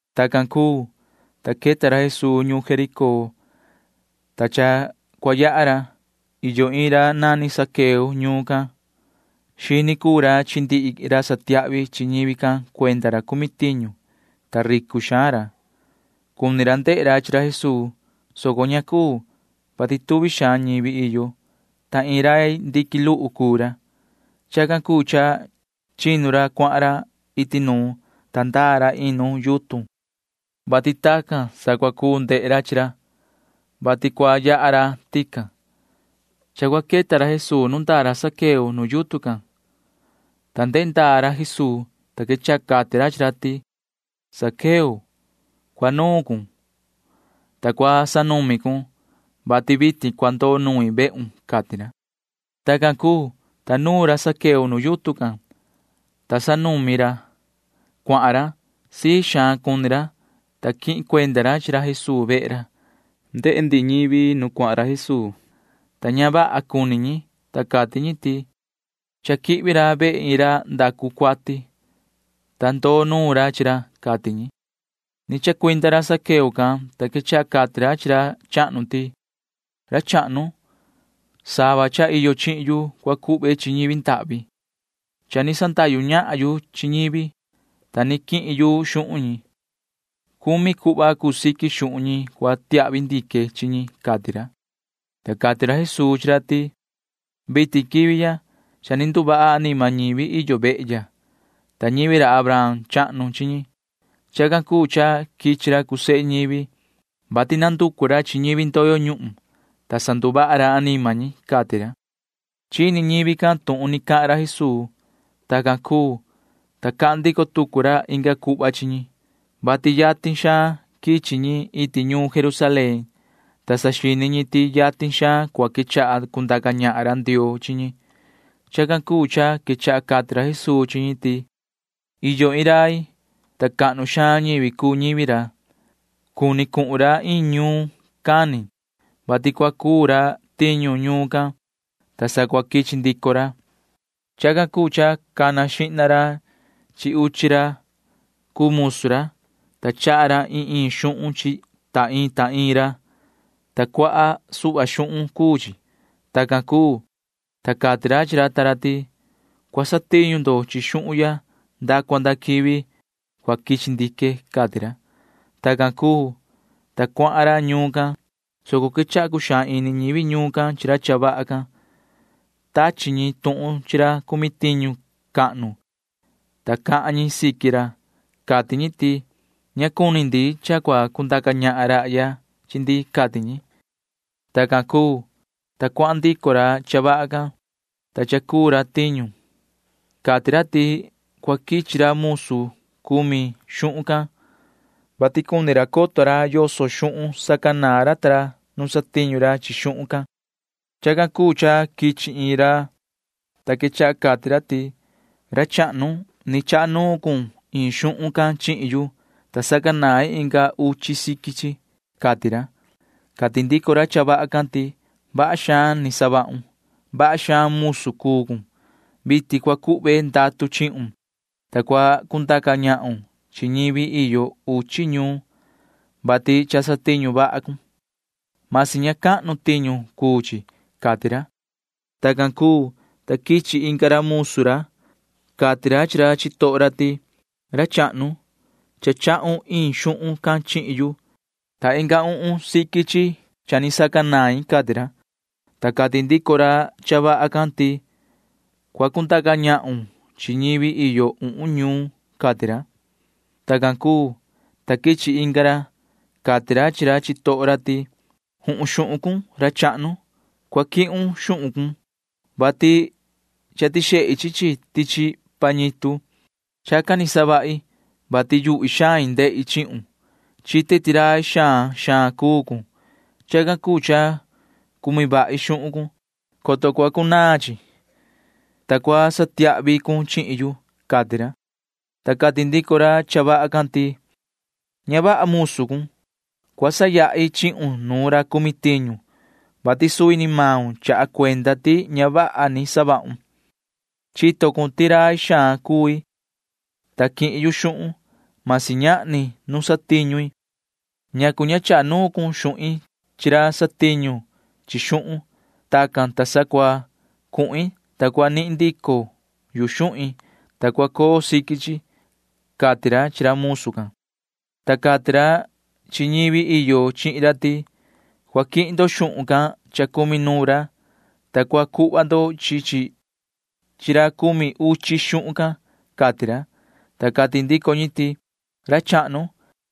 Tacan cuu, ta queta ra Jesuu ñuun Jericó, ta cha cua yaha ra. Iyo iin ra nani Zaqueo ñuun can. Xini cuu ra chi ndihi ra satiahvi chi ñivi can cuenda ra cumi tiñu, ta ricu xaan ra. Cuni ra ndehe ra chi ra Jesuu, soco ña cuu, vati tuvi xaan ñivi iyo, ta iin rai ndiqui luhu cuu ra. Chacan cuu cha chinu ra cuahan ra iti nuun, ta ndaa ra iin nu yutun, vati tacan sa cua cuu ndehe ra chi ra, vati cua yaha ra tican. Cha cua queta ra Jesuu nu ndaa ra Zaqueo nu yutun can, ta ndehe ndaa ra Jesuu, ta quechaha cati ra chi ra ti: ―Yoho Zaqueo, cua nuun cun, ta cua sanumi cun, vati vitin cua ndoo nuin vehun ―cati ra. Tacan cuu, ta nuun ra Zaqueo nu yutun can, ta sanumi ra cuahan ra. Sii xaan cuni ra, ta quihin cuenda ra chi ra Jesuu vehe ra. Ndehe ndihi ñivi nu cuahan ra Jesuu, ta ña vaha cuni ñi, ta cati ñi ti: ―Cha quihvi ra vehe iin ra ndacu cuati, ta ndoo nuun ra chi ra ―cati ñi. Ni chacuinda ra Zaqueo can, ta quechaha cati ra chi ra chahnu ti: ―Ra chahnu, sava cha iyo chihin yu cua cuhve chi ñivi ndahvi. Cha ni sandahyu ñahan yu chi ñivi, ta ni quihin yu xuhun ñi. Cumi cuhva cuu siqui xuhun ñi cua tiahvi ndique chi ñi ―cati ra. Ta cati ra Jesuu chi ra ti: ―Vitin quivi ya cha ni nduvaha anima ñivi iyo vehe ya, ta ñivi ra Abraham chahnu chi ñi. Chacan cuu cha quichi ra cuu sehe ñivi, vati nanducu ra chi ñivi ndoyo ñuhun, ta sanduvaha ra anima ñi ―cati ra. Chini ñivi can tuhun ni cahan ra Jesuu. Tacan cuu, ta cahan ndico tucu ra inga cuhva chi ñi, vati yatin xaan quichi ñi iti ñuun Jerusalén, ta saxini ñi ti yatin xaan cua quechaha cundaca ñahan ra Ndioo chi ñi. Chacan cuu cha quechaha cati ra Jesuu chi ñi ti: ―Iyo iin rai, ta cahnu xaan ñivi cuu ñivi ra. Cuni cuhun ra iin ñuun cani, vati cua cuu ra tiñu ñuun can, ta sa cua quichi ndico ra. Chacan cuu cha cana xihna ra chi uchi ra cuu musu ra, ta chaha ra iin iin xuhun chi ta iin ta iin ra, ta cuaha suhva xuhun cuu chi. Tacan cuu, ta cati ra chi ra ta ra ti: “Cua satiñu ndo chi xuhun ya nda cua nda quivi cua quichi ndique,” cati ra. Tacan cuu, ta cuahan ra ñuun can, soco quechaha cuxaan ini ñivi ñuun can chi ra cha vaha can. Tachi ñi tuhun chi ra cumi tiñu cahnu, ta cahan ñi siqui ra. Cati ñi ti: “Ña cuni ndi cha cua cundaca ñahan rahya chi ndi,” cati ñi. Tacan cuu, ta cuahan ndico ra cha vaha can, ta cha cuu ra tiñu. Cati ra ti cua quichi ra musu cumi xuhun can, vati cuni ra coto ra yoso xuhun sacanaan ra ta ra nu satiñu ra chi xuhun can. Chacan cuu cha quichi iin ra, ta quechaha cati ra ti: “Ra chahnu, ni chaha nuun cun iin xuhun can chihin yu, ta sacanain inga uchi chi siqui chi,” cati ra. Cati ndico ra cha vaha can ti: “Vaha xaan ni savahun. Vaha xaan musu cuu cun. Vitin cua cuhve ndatu chihun, ta cua cundaca ñahun chi ñivi iyo uchi ñuun, vati cha satiñu vaha cun―masi ña cahnu tiñu cuu chi,” cati ra. Tacan cuu, ta quichi inga ra musu ra. Cati ra chi ra chitoho ra ti: “Ra chahnu, cha chahun iin xuhun can chihin yu, ta inga uhun chi siqui chi cha sacanain,” cati ra, ta cati ndico ra cha vaha can ti: “Cua cundaca ñahun chi ñivi iyo uhun ñuun,” cati ra. Tacan cuu, ta quichi inga ra. Cati ra chi ra chitoho ra ti: “Juhun, xuhun cun, ra chahnu. Cua quihun xuhun cun, vati cha tixehi chi chi tichi pañitu. Chacan ni savahi, vati yuhvi xain ndehi chihun. Chite ti rai xaan xaan cuu cun. [Chacan cuu cha cumi vahi xuhun cun,] coto cuanaan chi, ta cua satiahvi cun chihin yu,” cati ra, ta cati ndico ra cha vaha can ti: “Ña vaha musu cuun. Cua sayahi chihun nu ra cumi tiñu, vati suvi ni maun chaha cuenda ti ña vaha ni savahun. Chito cun ti rai xaan cui, ta quihin yu xuhun―masi ñahni nu satiñu i. ¿Ñacu ña chaha nuun cun xuhin chi ra nu satiñu ra chi xuhun? Tacan, ta sa cua cuhin, ta cua nihin ndico yu xuhin, ta cua coo siqui chi,” cati ra chi ra musu can, ta cati ra chi ñivi iyo chihin ra ti: “Cua quihin ndo xuhun can cha cumi nuun ra, ta cua cuhva ndo chi chi chi ra cumi uchi xuhun can,” cati ra, ta cati ndico ñi ti: “Ra chahnu,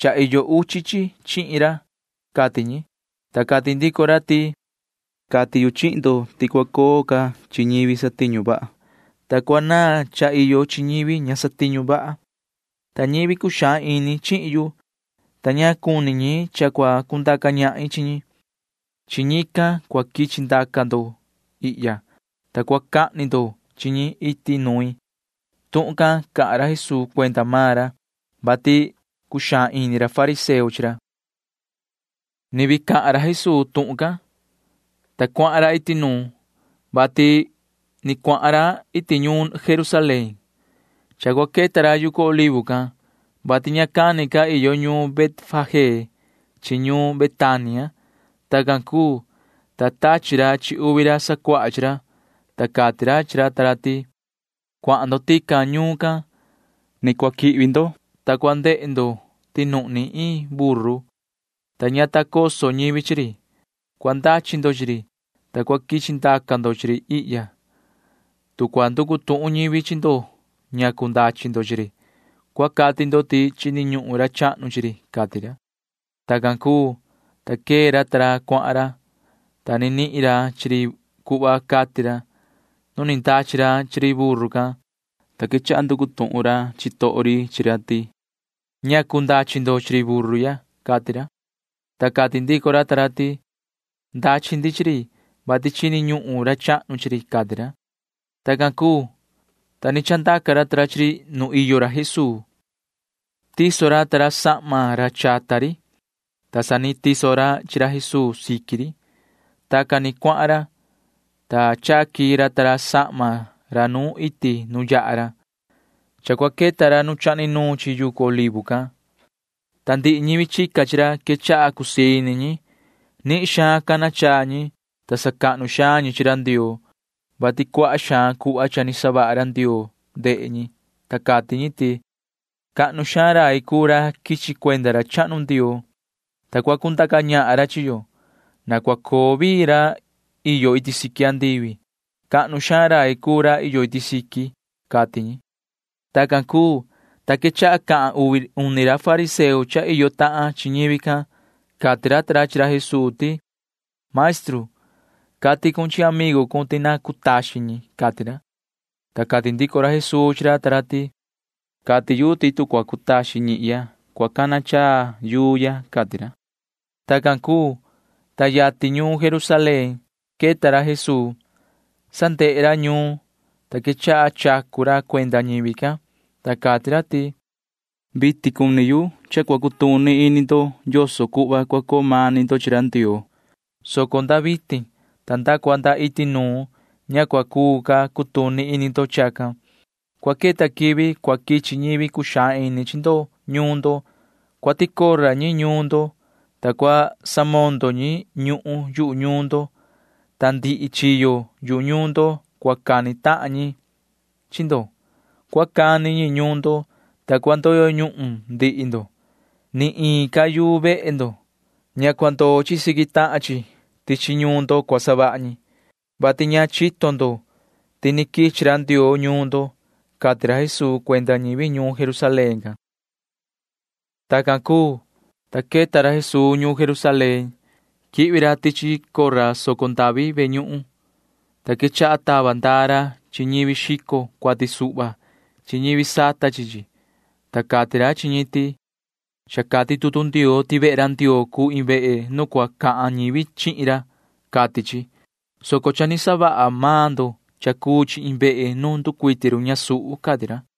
cha iyo uchi chi chihin ra,” cati ñi, ta cati ndico ra ti: “Cati yu chihin ndo ti cua coo ca chi ñivi satiñu vaha, ta cua naan cha iyo chi ñivi ña satiñu vaha. Ta ñivi cuxaan ini chihin yu, ta ña cuni ñi cha cua cundaca ñahin chi ñi―chi ñican cua quichi ndaca ndo ihya, ta cua cahni ndo chi ñi iti nuin.” [Tuhun can cahan ra Jesuu cuenda maan ra, vati cuxaan ini ra fariseo chi ra.] Ni vii cahan ra Jesuu tuhun can, ta cuahan ra iti nuun, vati ni cuahan ra iti ñuun Jerusalén. Cha cua queta ra yucu Olivo can, vati ña cani ca iyo ñuun Betfagé chi ñuun Betania. Tacan cuu, ta tachi ra chi uvi ra sacuaha chi ra, ta cati ra chi ra ta ra ti: ―Cuahan ndo tican ñuun can. Sa cua quihvi ndo, ta cua ndehe ndo ti nuhni iin buru, ta ña ta coso ñivi chi ri. Cua ndachi ndo chi ri, ta cua quichi ndaca ndo chi ri ihya. Tu cua nducu tuhun ñivi chi ndo ñacu ndachi ndo chi ri, cua cati ndo ti chini ñuhun ra chahnu chi ri ―cati ra. Tacan cuu, ta quee ra ta ra cuahan ra, ta ni nihin ra chi ri cuhva cati ra. Nu ni ndachi ra chi ri buru can, ta quechaha nducu tuhun ra chitoho ri chi ra ti: ―¿Ñacu ndachi ndo chi ri buru ya? ―cati ra. Ta cati ndico ra ta ra ti: ―Ndachi ndi chi ri, vati chini ñuhun ra chahnu chi ri ―cati ra. Tacan cuu, ta ni chandaca ra chi ri nu iyo ra Jesuu. Tiso ra ta ra sahma ra chata ri, ta sa ni tiso ra chi ra Jesuu siqui ri. Tacan ni cuahan ra, ta chaqui ra ta ra sahma ra nu iti nu yaha ra. Cha cua queta ra nu cha ni nuun chi yucu Olivo can, ta ndihi ñivi chica chi ra quechaha cusii ini ñi. Nihin xaan cana chaa ñi, ta sacahnu xaan ñi chi ra Ndioo, vati cuaha xaan cuhva cha ni savaha ra Ndioo ndehe ñi, ta cati ñi ti: ―¡Cahnu xaan rai cuu ra quichi cuenda ra chahnu Ndioo, ta cua cundaca ñahan ra chi yo! ¡Na cua coo vii ra iyo iti siqui andivi! ¡Cahnu xaan rai cuu ra iyo iti siqui! ―cati ñi. Tacan cuu, ta quechaha cahan uvi uni ra fariseo cha iyo tahan chi ñivi can. Cati ra ta ra chi ra Jesuu ti: ―Maestru, cati cun chi amigu cun ti na cutaxin ñi ―cati ra. Ta cati ndico ra Jesuu chi ra ta ra ti: ―Cati yu ti tu cua cutaxin ñihya, cua cana chaa maan yuu ya ―cati ra. Tacan cuu, ta yatin ñuun Jerusalén queta ra Jesuu. Sa ndehe ra ñuun, ta quechaha chacu ra cuenda ñivi can, ta cati ra ti: ―Cha cua cutuni ini ndo vitin yoso cuhva cua coo mani ndo chi ra Ndioo cuni yu, soco nda vitin ta nda cua nda iti nuun ña cua cuu ca cutuni ini ndo chacan. Cua queta quivi cua quichi ñivi cuxaan ini chi ndo ñuun ndo. Cua ticora ñi ñuun ndo, ta cua samondo ñi ñuhun yuhu ñuun, ta ndihi chiyo yu ñuun ndo cua cani tahan ñi chi ndo. Cua cani ñi ñuun ndo, ta cua ndoyo ñuhun ndihi ndo. Ni iin ca yuu vehe ndo―ña cua ndoo siqui tahan chi tichi ñuun ndo cua savaha ñi, vati ña chito ndo ti ni quichi ra Ndioo ñuun ndo ―cati ra Jesuu cuenda ñivi ñuun Jerusalén can. [Tacan cuu, ta queta ra Jesuu ñuun Jerusalén.] Quihvi ra tichi soco ndavi ve ñuhun, ta quechaha tava ndaa ra chi ñivi xico cuati suhva chi ñivi sata chi chi, ta cati ra chi ñi ti: ―Cha cati tutu Ndioo ti vehe ra Ndioo cuu iin vehe nu cua cahan ñivi chihin ra, cati chi, soco cha ni savaha maan ndo cha cuu chi iin vehe nu nducuiti run ñasuhu ―cati ra.